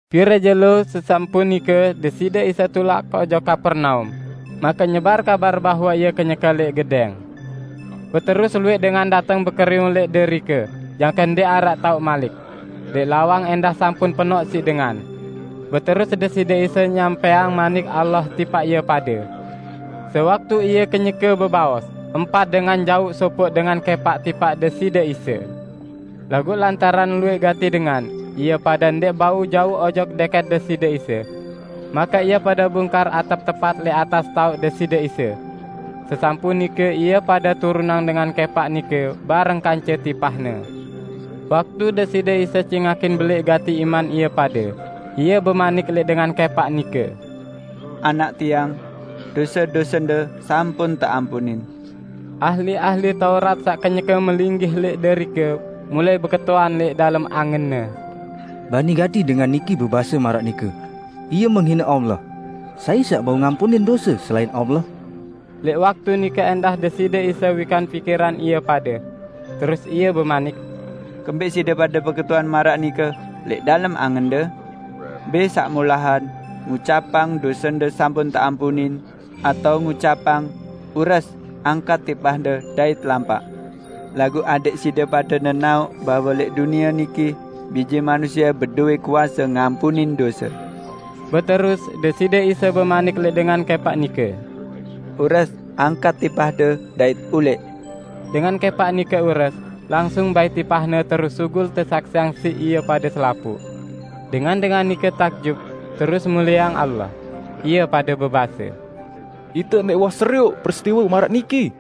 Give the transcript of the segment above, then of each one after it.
Pire jelo sesampun nike Deside Isa tulak ojok Kapernaum, make nyebar kabar bahwe Ie kenyeke lẽq gedẽng. Beterus luwẽq dengan dateng bekeriwung lẽq derike jangke ndẽq araq taoq malik. Lẽq lawang ẽndah sampun penoq siq dengan. Beterus Deside Isa nyampẽang Manik Allah tipaq ie pade. Sewaktu Ie kenyeke bebaos, empat dengan jauq sopoq dengan kẽpaq tipaq Deside Isa. Laguq lantaran luwẽq gati dengan, ie pade ndẽq bau jauq ojok dẽkẽt Deside Isa. Make ie pade bungkar atep tepat lẽq atas taoq Deside Isa. Sesampun nike ie pade turunang dengan kẽpaq nike bareng kance tipahne. Waktu Deside Isa cingakin belẽq gati iman ie pade, Ie bemanik lẽq dengan kẽpaq nike, "Anak Tiang, dose-dosende sampun teampunin." Ahli-ahli Taurat saq kenyeke melinggih lẽq derike mulai beketuan lẽq dalem angenne, "Bani gati dengan niki bebase maraq nike! Ie menghine Allah. Sai saq bau ngampunin dose selain Allah?" Lẽq waktu nike ẽndah Deside Isa wikan pikiran ie pade. Terus Ie bemanik, "Kembẽq side pade beketuan maraq nike lẽq dalem angende? Mbẽ saq molahan: ngucapang, 'Dosende sampun teampunin', atao ngucapang, 'Ures, angkat tipahde dait lampaq'? Laguq adẽq side pade nenaoq bahwe lẽq dunie niki Bije Manusie bedowẽ kuase ngampunin dose." Beterus, Deside Isa bemanik lẽq dengan kẽpaq nike, "Ures, angkat tipahde dait ulẽq!" Dengan kẽpaq nike ures, langsung bait tipahne terus sugul tesaksiang siq ie pade selapuq. Dengan-dengan nike takjub, terus melieang Allah, ie pade bebase, "Ite ndẽq uwah serioq peristiwe maraq niki!"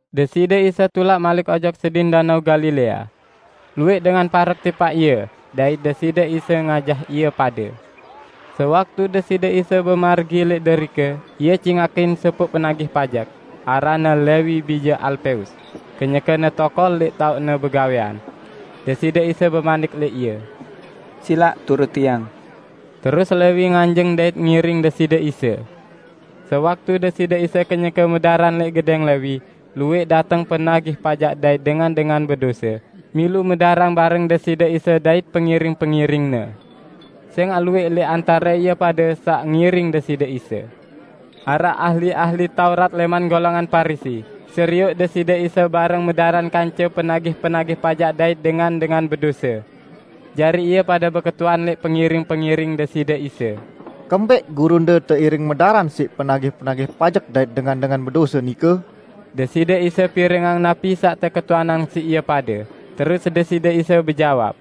Deside Isa tulak malik ojok sedin Danao Galilea. Luwẽq dengan parek tipaq Ie, dait Deside Isa ngajah ie pade. Sewaktu Deside Isa bemargi lẽq derike, Ie cingakin sopoq penagih pajek, aranne Lewi bije Alpeus, kenyekene tokol lẽq taoqne begawẽan. Deside Isa bemanik lẽq ie, "Silaq turut Tiang!" Terus Lewi nganjeng dait ngiring Deside Isa. Sewaktu Deside Isa kenyeke medaran lẽq gedẽng Lewi, luwẽq dateng penagih pajek dait dengan-dengan bedose, milu medaran bareng Deside Isa dait pengiring-pengiring-Ne. Sẽngaq luwẽq lẽq antare ie pade saq ngiring Deside Isa. Araq ahli-ahli Taurat lẽman golongan Parisi serioq Deside Isa bareng medaran kance penagih-penagih pajek dait dengan-dengan bedose. Jari ie pade beketuan lẽq pengiring-pengiring Deside Isa, "Kembẽq gurunde teiring medaran siq penagih-penagih pajek dait dengan-dengan bedose?" Deside Isa pirengang napi saq teketuanang siq ie pade, terus Deside Isa bejawab,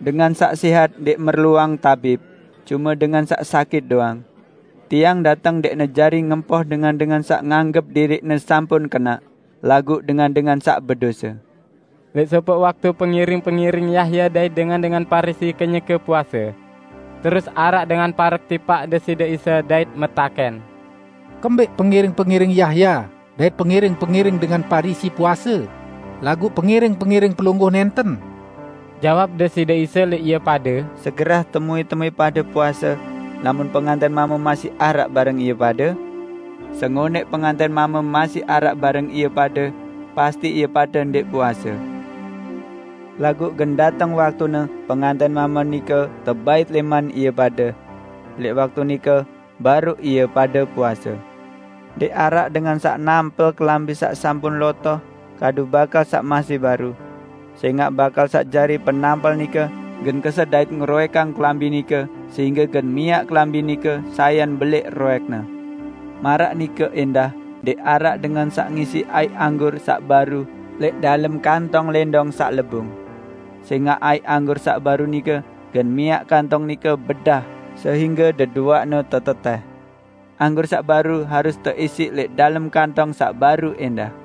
"Dengan saq sẽhat ndẽq merluang tabib, cume dengan saq sakit doang. Tiang dateng ndẽqne jari ngempoh dengan-dengan saq nganggep diriqne sampun kenaq, laguq dengan-dengan saq bedose." Lẽq sopoq waktu pengiring-pengiring Yahya dait dengan-dengan Parisi kenyeke puase. Terus araq dengan parek tipaq Deside Isa dait metakẽn, "Kembẽq pengiring-pengiring Yahya dait pengiring-pengiring dengan Parisi puase, laguq pengiring-pengiring Pelungguh nẽnten?" Jawab Deside Isa, "Lẽq gawẽ ngawinang, napi temuẽ-temuẽ puase lamun pengantẽn mame masih araq bareng ie pade? Sengonẽq pengantẽn mame masih araq bareng ie pade, pasti ie pade ndẽq puase. Laguq gen dateng waktune pengantẽn mame nike tebait lẽman ie pade. Lẽq waktu nike baruq ie pade puase. Ndẽq araq dengan saq nampel kelambi saq sampun lotoh kadu bakal saq masih baru. Sẽngaq bakal saq jari penampel nike gen keset dait ngeroẽkang kelambi nike sehingge gen miaq kelambi nike sayan belẽq roẽkne. Maraq nike ẽndah ndẽq araq dengan saq ngisiq aiq anggur saq baru lẽq dalem kantong lẽndong saq lebung. Sẽngaq aiq anggur saq baru nike gen miaq kantong nike bedah sehingge deduaqne tetetẽh. Anggur saq baru harus teisiq lẽq dalem kantong saq baru ẽndah!"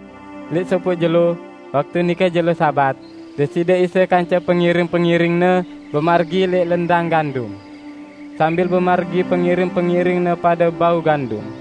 Lẽq sopoq jelo, waktu nike jelo Sabat, Deside Isa kance pengiring-pengiring-Ne bemargi lẽq lendang gandum. Sambil bemargi pengiring-pengiring-Ne pade bau gandum.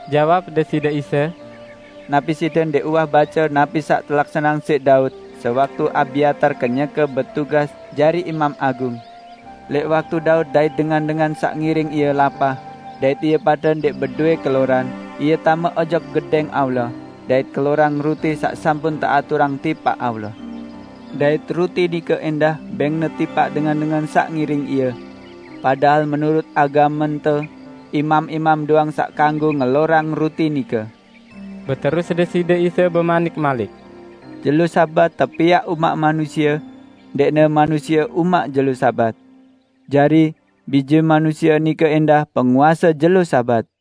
Jawab Deside Isa, "Napi side ndẽq uwah bace napi saq telaksaneang siq Daud sewaktu Abyatar kenyeke betugas jari Imam Agung. Lẽq waktu Daud dait dengan-dengan saq ngiring ie lapah dait ie pade ndẽq bedowẽ keloran, ie tame ojok Gedẽng Allah, dait kelorang ruti saq sampun teaturang tipaq Allah. Dait ruti nike ẽndah bẽngne tipaq dengan-dengan saq ngiring ie. Padahal menurut agamente, imam-imam doang saq kanggo ngelorang ruti nike." Beterus Deside Isa bemanik malik, "Jelo Sabat tepiaq umaq manusie; ndẽqne manusie umaq jelo Sabat. Jari, Bije Manusie nike ẽndah Penguase jelo Sabat."